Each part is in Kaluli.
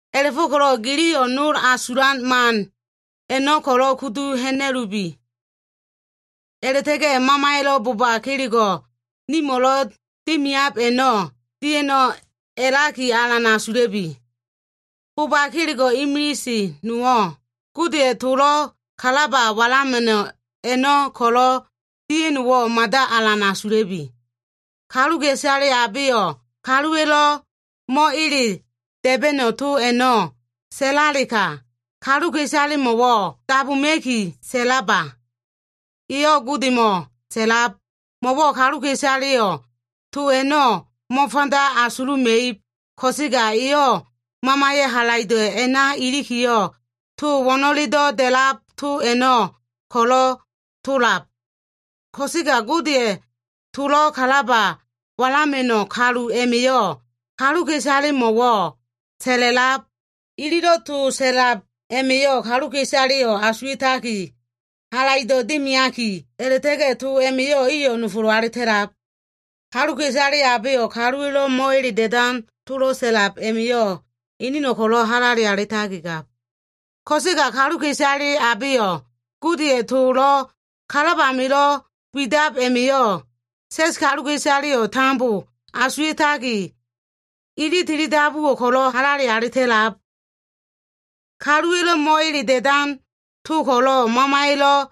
A꞉la꞉fo꞉ko꞉lo꞉ giliyo꞉ nol asulan man a꞉no꞉ ko꞉lo꞉ kudu ha꞉na꞉lubi. A꞉la꞉ta꞉ga꞉ Mamaya꞉lo꞉ boba kelego꞉ nimo꞉lo꞉ dimiab a꞉no꞉ dia꞉no꞉ a꞉laki alan asula꞉bi. Boba kelego꞉ imilise nowo꞉, Godeya꞉ tolo꞉ kalaba walama꞉no꞉ a꞉no꞉ ko꞉lo꞉ dia꞉no꞉wo꞉ mada alan asula꞉bi. Kaluka꞉isale abeyo꞉ kaluwa꞉lo꞉ mo꞉ele da꞉ba꞉no꞉ to a꞉no꞉ sa꞉lalega, kaluka꞉isalemo꞉ dabuma꞉ki sa꞉laba. Eyo꞉ Godemo꞉ sa꞉lab. Mo꞉wo꞉ kaluka꞉isaleyo꞉ to a꞉no꞉ mo꞉fanda asuluma꞉ib, ko꞉sega, eyo꞉ Mamaya꞉ halaido꞉ a꞉na ilikiyo꞉, to wo꞉no꞉ledo꞉ da꞉lab to a꞉no꞉ ko꞉lo꞉ tolab. Ko꞉sega Godeya꞉ tolo꞉ kalaba walama꞉no꞉ kalu a꞉ma꞉yo꞉ kaluka꞉isalemo꞉wo꞉ sa꞉la꞉lab. Ililo꞉ to sa꞉lab a꞉ma꞉yo꞉ kaluka꞉isaleyo꞉ asuwa꞉taki, halaido꞉ dimiaki, a꞉la꞉ta꞉ga꞉ to a꞉ma꞉yo꞉ iyo꞉ nofolo꞉ alita꞉lab. Kaluka꞉isale abeyo꞉ kaluwa꞉lo꞉ mo꞉ele da꞉dan tolo꞉ sa꞉lab a꞉ma꞉yo꞉, eneno꞉ ko꞉lo꞉ halale alitakigab. Ko꞉sega kaluka꞉isale abeyo꞉ Godeya꞉ tolo꞉ kalab amilo꞉ widab a꞉ma꞉yo꞉, sa꞉s kaluka꞉isaleyo꞉ tambo asuwa꞉taki, ili tili dabuwo꞉ ko꞉lo꞉ halale alita꞉lab. Kaluwa꞉lo꞉ mo꞉ele da꞉dan to ko꞉lo꞉ Mamaya꞉lo꞉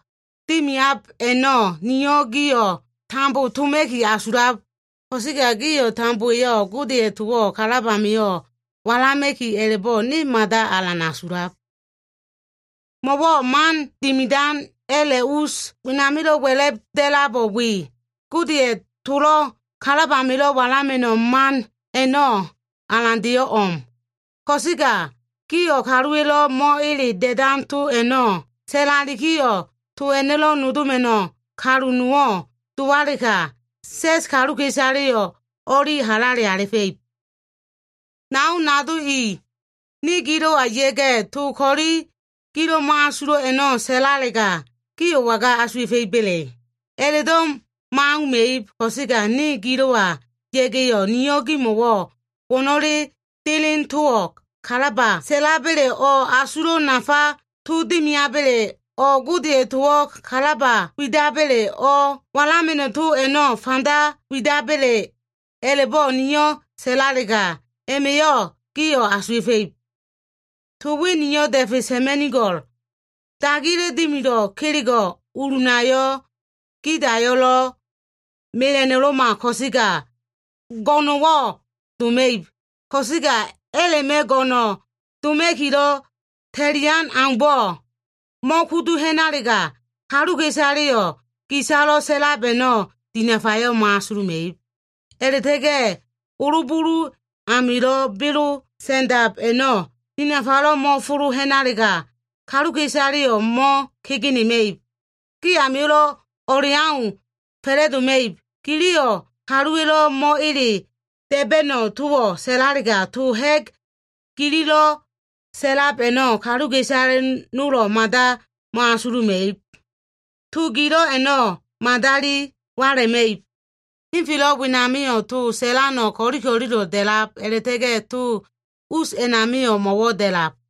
dimiab a꞉no꞉, niyo꞉ gio꞉ tambo toma꞉ki asulab. Ko꞉sega gio꞉ tambowa꞉yo꞉ Godeya꞉ towo꞉ kalab amio꞉ walama꞉ki a꞉la꞉bo꞉, ne mada alan asulab. Mo꞉wo꞉ man dimidan a꞉la꞉ us wenamilo꞉ wa꞉la꞉b da꞉labo꞉ we, Godeya꞉ tolo꞉ kalab amilo꞉ walama꞉no꞉ man a꞉no꞉ alandeyo꞉ o꞉m. Ko꞉sega gio꞉ kaluwa꞉lo꞉ mo꞉ele da꞉dan to a꞉no꞉ sa꞉lalikiyo꞉, to a꞉no꞉lo꞉ nodoma꞉no꞉ kalu nowo꞉ dowalega, sa꞉s kaluka꞉isaleyo꞉ o꞉li halale alifa꞉ib. Nao nado i, ne gilo꞉wa ya꞉ga꞉ to ko꞉li, gilo꞉ mo꞉asulo꞉ a꞉no꞉ sa꞉lalega, gio꞉ waga asufa꞉iba꞉le? A꞉la꞉do꞉ mo꞉auma꞉ib. Ko꞉sega ne gilo꞉wa ya꞉ga꞉yo꞉, niyo꞉ gimo꞉wo꞉ to wo꞉no꞉lelo꞉ deleno꞉ kalaba sa꞉laba꞉le, o꞉ asulo꞉ nafa to dimiaba꞉le, o꞉ Godeya꞉ towo꞉ kalaba widaba꞉le o꞉ walama꞉no꞉ to a꞉no꞉ fanda widaba꞉le, a꞉la꞉bo꞉ niyo꞉ sa꞉lalega, a꞉ma꞉yo꞉ gio꞉ asuwa꞉fa꞉ib. To we niyo꞉ da꞉fe sa꞉ma꞉nigo꞉l. Dagiya꞉lo꞉ dimido꞉ kelego꞉, ulunayo꞉, gidayo꞉lo꞉, mela꞉no꞉lo꞉ma ko꞉sega, go꞉no꞉wo꞉ doma꞉ib. Ko꞉sega a꞉la꞉ma꞉ go꞉no꞉ doma꞉kilo꞉ ta꞉lian aumbo꞉ mo꞉kudu ha꞉nalega, kaluka꞉isaleyo꞉ gisalo꞉ sa꞉lab a꞉no꞉ dinafayo꞉ mo꞉asuluma꞉ib. A꞉la꞉ta꞉ga꞉ olo bulu amilo꞉ belo sa꞉ndab a꞉no꞉ dinafalo꞉ mo꞉folo ha꞉nalega, kaluka꞉isaleyo꞉ mo꞉kegenema꞉ib. Gi amio꞉lo꞉ o꞉leau fa꞉la꞉doma꞉ib. Giliyo꞉ kaluwa꞉lo꞉ mo꞉ele da꞉ba꞉no꞉ towo꞉ sa꞉lalega, to ha꞉g gililo꞉ sa꞉lab a꞉no꞉ kaluka꞉isale nolo꞉ mada mo꞉asuluma꞉ib. To gilo꞉ a꞉no꞉ madali walama꞉ib. Henfelo꞉ wenamio꞉ to sa꞉lano꞉ ko꞉li ko꞉lilo꞉ da꞉lab, a꞉la꞉ta꞉ga꞉ to us a꞉namio꞉ mo꞉wo꞉ da꞉lab.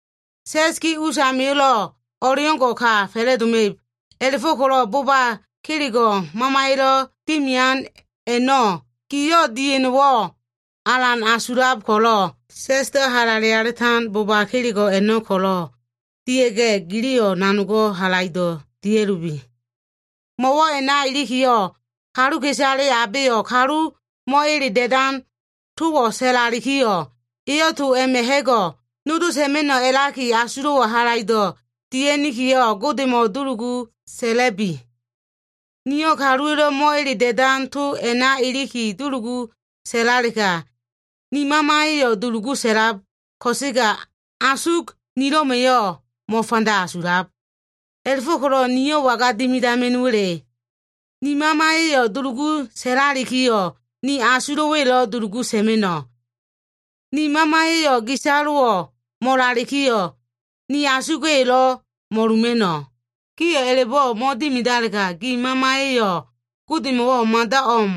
Sa꞉s gi usamio꞉lo꞉ o꞉leo꞉ngo꞉ ka fa꞉la꞉doma꞉ib. A꞉la꞉fo꞉ko꞉lo꞉ boba kelego꞉ Mamaya꞉lo꞉ dimian a꞉no꞉ gio꞉ dia꞉no꞉wo꞉ alan asulab ko꞉lo꞉, sa꞉sdo꞉ halale alitan boba kelego꞉ a꞉no꞉ ko꞉lo꞉ dia꞉ga꞉, giliyo꞉ nanogo꞉ halaido꞉ dia꞉lubi. Mo꞉wo꞉ a꞉na ilikiyo꞉, kaluka꞉isale abeyo꞉ kalu mo꞉ele da꞉dan towo꞉ sa꞉lalikiyo꞉, eyo꞉ to a꞉ma꞉ ha꞉go꞉ nodo sa꞉ma꞉no꞉ a꞉laki asulo꞉wo꞉ halaido꞉ dia꞉nikiyo꞉, Godemo꞉ dulugu sa꞉la꞉bi. Niyo꞉ kaluwa꞉lo꞉ mo꞉ele da꞉dan to a꞉na iliki dulugu sa꞉lalega, ni mamaya꞉yo꞉ dulugu sa꞉lab, ko꞉sega asug nilo꞉ma꞉yo꞉ mo꞉fanda asulab. A꞉la꞉fo꞉ko꞉lo꞉ niyo꞉ waga dimidama꞉no꞉wa꞉le? Ni mamaya꞉yo꞉ dulugu sa꞉lalikiyo꞉, ni asuga꞉yo꞉lo꞉ dulugu sa꞉ma꞉no꞉. Ni mamaya꞉yo꞉ gisalo꞉ mo꞉lalikiyo꞉, ni asuga꞉yo꞉lo꞉ mo꞉luma꞉no꞉. Gio꞉ a꞉la꞉bo꞉ mo꞉dimidalega, gi mamaya꞉yo꞉ Godemo꞉wo꞉ mada o꞉m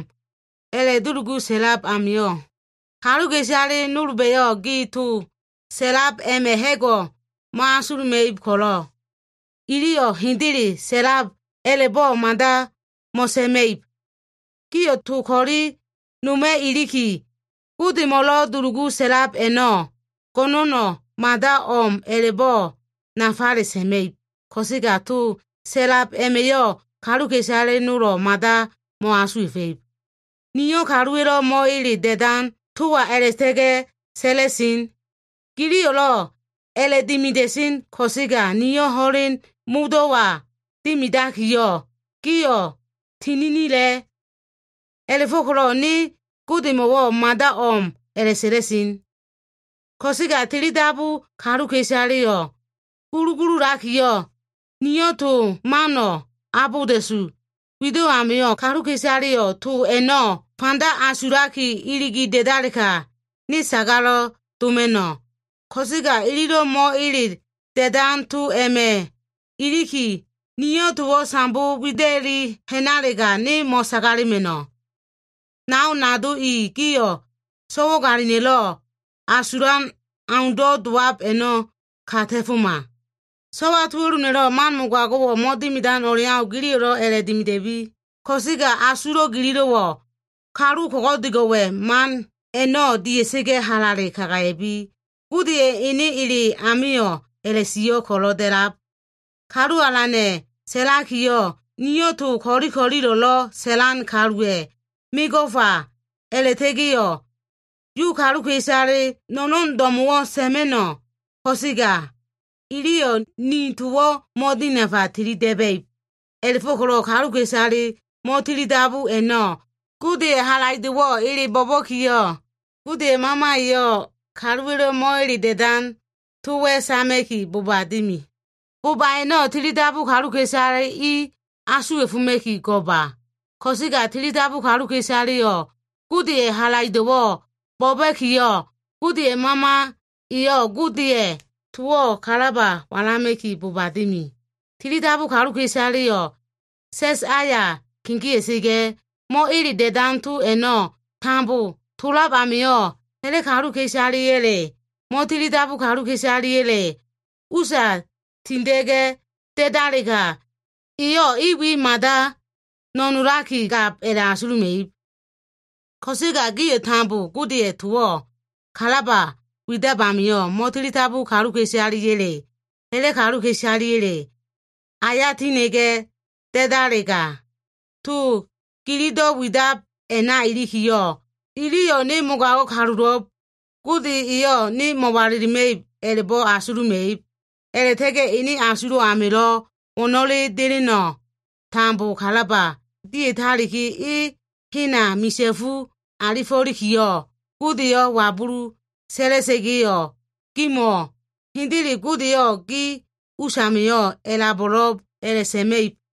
a꞉la꞉dulugu sa꞉lab amio꞉, kaluka꞉isale nolba꞉yo꞉ gi to sa꞉lab a꞉ma꞉ ha꞉go꞉ mo꞉asuluma꞉ib ko꞉lo꞉, iliyo꞉ hendele sa꞉lab a꞉la꞉bo꞉ mada mo꞉sa꞉ma꞉ib. Giyo꞉ to ko꞉li noma꞉ iliki, Godemo꞉lo꞉ dulugu sa꞉lab a꞉no꞉, go꞉no꞉no꞉ mada o꞉m a꞉la꞉bo꞉ nafale sa꞉ma꞉ib, ko꞉sega to sa꞉lab a꞉ma꞉yo꞉ kaluka꞉isale nolo꞉ mada mo꞉asuwa꞉fa꞉ib. Niyo꞉ kaluwa꞉lo꞉ mo꞉ele da꞉dan towa a꞉la꞉ta꞉ga꞉ sa꞉la꞉sen. Giliyo꞉lo꞉ a꞉la꞉dimia꞉sen ko꞉sega niyo꞉ ho꞉len modo꞉wa dimidakiyo꞉, gio꞉ tininila꞉. A꞉la꞉fo꞉ko꞉lo꞉ ne Godemo꞉wo꞉ mada o꞉m a꞉la꞉sa꞉la꞉sen. Ko꞉sega tili dabu kaluka꞉isaleyo꞉ gulugululakiyo꞉, niyo꞉ to mano꞉ abolda꞉su wido꞉ amio꞉, kaluka꞉isaleyo꞉ to a꞉no꞉ fanda asulaki, iligi da꞉dalega, ne sagalo꞉ doma꞉no꞉. Ko꞉sega ililo꞉ mo꞉ele da꞉dan to a꞉ma꞉ iliki, niyo꞉ towo꞉ sambo wida꞉li ha꞉nalega, ne mo꞉sagalema꞉no꞉. Nao nado i, gio꞉ so꞉wagalina꞉lo꞉ asulan aundo꞉ dowab a꞉no꞉ ka ta꞉foma. So꞉wa tuo꞉luna꞉lo꞉ man mogago꞉wo꞉ mo꞉dimidan o꞉leau, giliyo꞉lo꞉ a꞉la꞉dimida꞉bi. Ko꞉sega asulo꞉ gililo꞉wo꞉, kalu ko꞉go꞉dego꞉wa꞉ man a꞉no꞉ dia꞉sa꞉ga꞉, halale kagaya꞉bi. Godeya꞉ ene ele amio꞉ a꞉la꞉sio꞉ ko꞉lo꞉ da꞉lab, “Kalu Alana꞉ sa꞉lakiyo꞉, ‘Niyo꞉ to ko꞉li ko꞉lilo꞉lo꞉ sa꞉lan kaluwa꞉ mego꞉fa a꞉la꞉ta꞉ga꞉yo꞉, Yu kaluka꞉isale no꞉no꞉n do꞉mo꞉wo꞉ sa꞉ma꞉no꞉ ko꞉sega, Iliyo꞉ ni towo꞉ mo꞉dinafa tili da꞉ba꞉ib.’” A꞉la꞉fo꞉ko꞉lo꞉ kaluka꞉isale mo꞉tilidabu a꞉no꞉ Godeya꞉ halaido꞉wo꞉ ele bo꞉ba꞉kiyo꞉, Godeya꞉ Mama eyo꞉ kaluwa꞉lo꞉ mo꞉ele da꞉dan towa꞉ sama꞉ki boba dimi. Bo꞉ba a꞉no꞉ tilidabu kaluka꞉isale i asuwa꞉foma꞉ki go꞉ma. Ko꞉sega tilidabu kaluka꞉isaleyo꞉ Godeya꞉ halaido꞉wo꞉ bo꞉ba꞉kiyo꞉, Godeya꞉ Mama eyo꞉ Godeya꞉ towo꞉ kalaba walama꞉ki boba dimi. Tilidabu kaluka꞉isaleyo꞉ sa꞉s aya kegea꞉sa꞉ga꞉, mo꞉ele da꞉dan to a꞉no꞉ tambo tolab amio꞉, ha꞉la꞉ kaluka꞉isaleya꞉le, mo꞉tilidabu kaluka꞉isaleya꞉le usa tinda꞉ga꞉ da꞉dalega, iyo꞉ i we mada no꞉nolakigab a꞉la꞉asuluma꞉ib. Ko꞉sega gio꞉ tambo Godeya꞉ towo꞉ kalaba widab amio꞉, mo꞉tilidabu kaluka꞉isaleya꞉le, ha꞉la꞉ kaluka꞉isaleya꞉le aya tinda꞉ga꞉ da꞉dalega, to gilido꞉ widab a꞉na ilikiyo꞉, iliyo꞉ “Ne mogago꞉ kalulo꞉b. Gode eyo꞉ ne mo꞉walilima꞉ib,” a꞉la꞉bo꞉ asuluma꞉ib. A꞉la꞉ta꞉ga꞉ enen asulo꞉ amilo꞉ wo꞉no꞉lelo꞉ deleno꞉ tambo kalaba dia꞉taliki, e hena misa꞉fu alifo꞉likiyo꞉, Godeyo꞉ wabulu sa꞉la꞉sa꞉ga꞉yo꞉, gimo꞉wo꞉, “Hendele, Godeyo꞉ gi usamio꞉ a꞉labo꞉lo꞉b,” a꞉la꞉sa꞉ma꞉ib.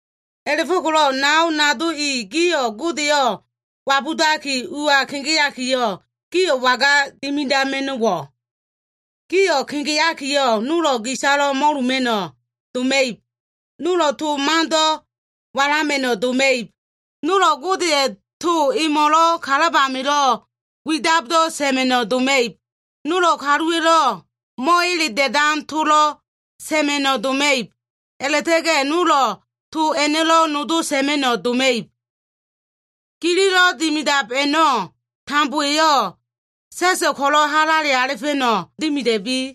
A꞉la꞉fo꞉ko꞉lo꞉ nao nado i, gio꞉ Godeyo꞉ wabudaki ua kegeakiyo꞉, gio꞉ waga dimidama꞉no꞉wo꞉? Gio꞉ kegeakiyo꞉, nolo꞉ gisalo꞉ mo꞉luma꞉no꞉ doma꞉ib. Nolo꞉ to mando꞉ walama꞉no꞉ doma꞉ib. Nolo꞉ Godeya꞉ to emo꞉lo꞉ kalab amilo꞉ widabdo꞉ sa꞉ma꞉no꞉ doma꞉ib. Nolo꞉ kaluwa꞉lo꞉ mo꞉ele da꞉dan tolo꞉ sa꞉ma꞉no꞉ doma꞉ib. A꞉la꞉ta꞉ga꞉ nolo꞉ to a꞉no꞉lo꞉ nodo sa꞉ma꞉no꞉ doma꞉ib. Gililo꞉ dimidab a꞉no꞉ tambowa꞉yo꞉, sa꞉so꞉ ko꞉lo꞉ halale alifa꞉no꞉ dimida꞉bi.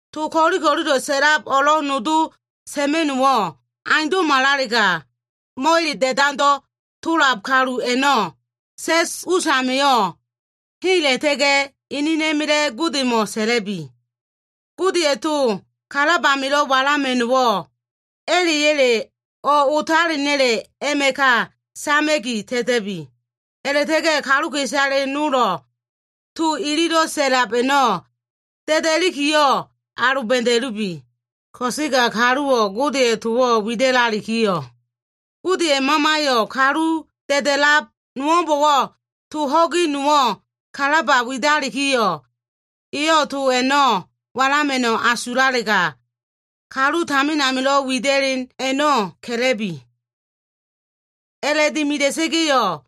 To ko꞉lilo꞉lo꞉ sa꞉lab o꞉lo꞉ nodo sa꞉ma꞉no꞉wo꞉ aundo꞉malalega, mo꞉ele da꞉dando꞉ tola꞉lab kalu a꞉no꞉ sa꞉s usamio꞉ hela꞉ta꞉ga꞉, enena꞉ma꞉la꞉ Godemo꞉ sa꞉la꞉bi. Godeya꞉ tolo꞉ kalab amilo꞉ walama꞉no꞉wo꞉, a꞉la꞉ya꞉le o꞉ otalena꞉le a꞉ma꞉ ka sama꞉ki ta꞉ta꞉bi. A꞉la꞉ta꞉ga꞉ kaluka꞉isale nolo꞉ to ililo꞉ sa꞉lab a꞉no꞉ da꞉da꞉likiyo꞉ aloba꞉da꞉lubi. Ko꞉sega kaluwo꞉ Godeya꞉ towo꞉ wida꞉lalikiyo꞉, Godeya꞉ Mamayo꞉ kalu da꞉da꞉lab nowo꞉mbo꞉wo꞉ to ho꞉gi nowo꞉ kalaba widalikiyo꞉, eyo꞉ to a꞉no꞉ walama꞉no꞉ asulalega, kalu tamin amilo꞉ wida꞉len a꞉no꞉ ka꞉la꞉bi. A꞉la꞉dimida꞉sa꞉ga꞉yo꞉,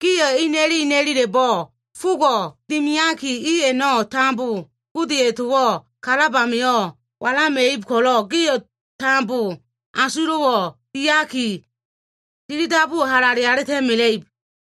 gio꞉ ina꞉li ina꞉lila꞉bo꞉ fogo꞉ dimiaki, i a꞉no꞉ tambo Godeya꞉ towo꞉ kalab amio꞉ walama꞉ib ko꞉lo꞉, gio꞉ tambo asulo꞉wo꞉ diaki, tili dabuwo꞉ halale alita꞉mela꞉ib.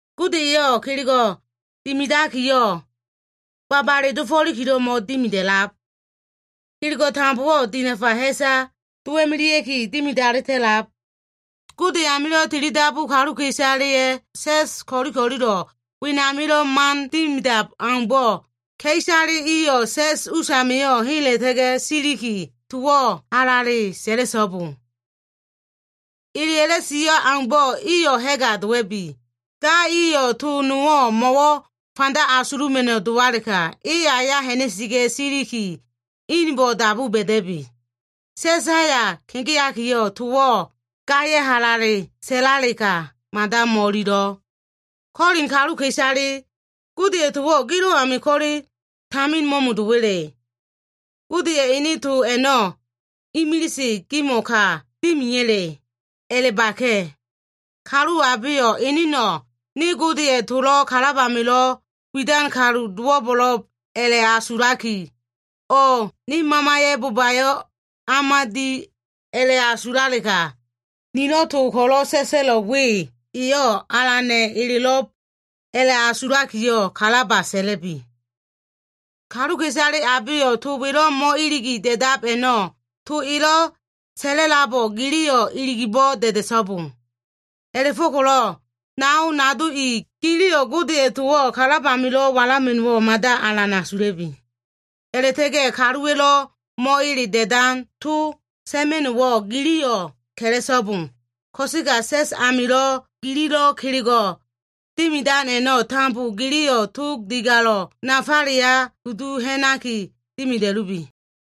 Gode eyo꞉ kelego꞉ dimidakiyo꞉, babale dofo꞉likilo꞉ mo꞉dimida꞉lab. Kelego꞉ tambowo꞉ dinafa ha꞉sa dowa꞉melea꞉ki dimidali ta꞉lab. Gode amilo꞉ tili dabu kaluka꞉isaleya꞉ sa꞉s ko꞉li ko꞉lilo꞉ wenamilo꞉ man dimidab aumbo꞉, ka꞉isale iyo꞉ sa꞉s usamio꞉ hela꞉ta꞉ga꞉ siliki, towo꞉ halale sa꞉la꞉so꞉bo. Eleya꞉lo꞉ sio꞉ aumbo꞉, iyo꞉ ha꞉ga dowa꞉bi. Ga iyo꞉ to nowo꞉ mo꞉wo꞉ fanda asuluma꞉no꞉ dowalega, e aya ha꞉na꞉sa꞉ga꞉ siliki, ene inbo꞉ dabu ba꞉da꞉bi. Sa꞉s aya kegeakiyo꞉ towo꞉ gaya꞉ halale sa꞉lalega mada mo꞉ililo꞉. Kolin kaluka꞉isale, Godeya꞉ towo꞉ gilo꞉ ami ko꞉le tamin mo꞉mo꞉do꞉wa꞉le? Godeya꞉ ene to a꞉no꞉ imilise gimo꞉ ka dimeya꞉le? A꞉la꞉baka꞉. Kalu abeyo꞉ eneno꞉, “Ne Godeya꞉ tolo꞉ kalab amilo꞉ widan kalu dowo꞉lo꞉b” a꞉la꞉asulaki, o꞉ “Ne mamaya꞉ bobayo꞉ o꞉ma di” a꞉la꞉asulalega, nilo꞉ to ko꞉lo꞉ sa꞉sa꞉lo꞉ we, eyo꞉ Alana꞉ elelo꞉b a꞉la꞉asulakiyo꞉ kalaba sa꞉la꞉bi. Kaluka꞉isale abeyo꞉ to welo꞉ mo꞉iligi da꞉dab a꞉no꞉, to elo꞉ sa꞉labo꞉lo꞉ giliyo꞉ iligibo꞉ da꞉da꞉so꞉bo. A꞉la꞉fo꞉ko꞉lo꞉ nao nado i, giliyo꞉ Godeya꞉ towo꞉ kalab amilo꞉ walama꞉no꞉wo꞉ mada alan asula꞉bi. A꞉la꞉ta꞉ga꞉ kaluwa꞉lo꞉ mo꞉ele da꞉dan to sa꞉ma꞉no꞉wo꞉ giliyo꞉ ka꞉la꞉so꞉bo. Ko꞉sega sa꞉s amilo꞉ gililo꞉ kelego꞉ dimidan a꞉no꞉ tambo, giliyo꞉ tog digalo꞉ nafaleya kudu ha꞉naki dimida꞉lubi.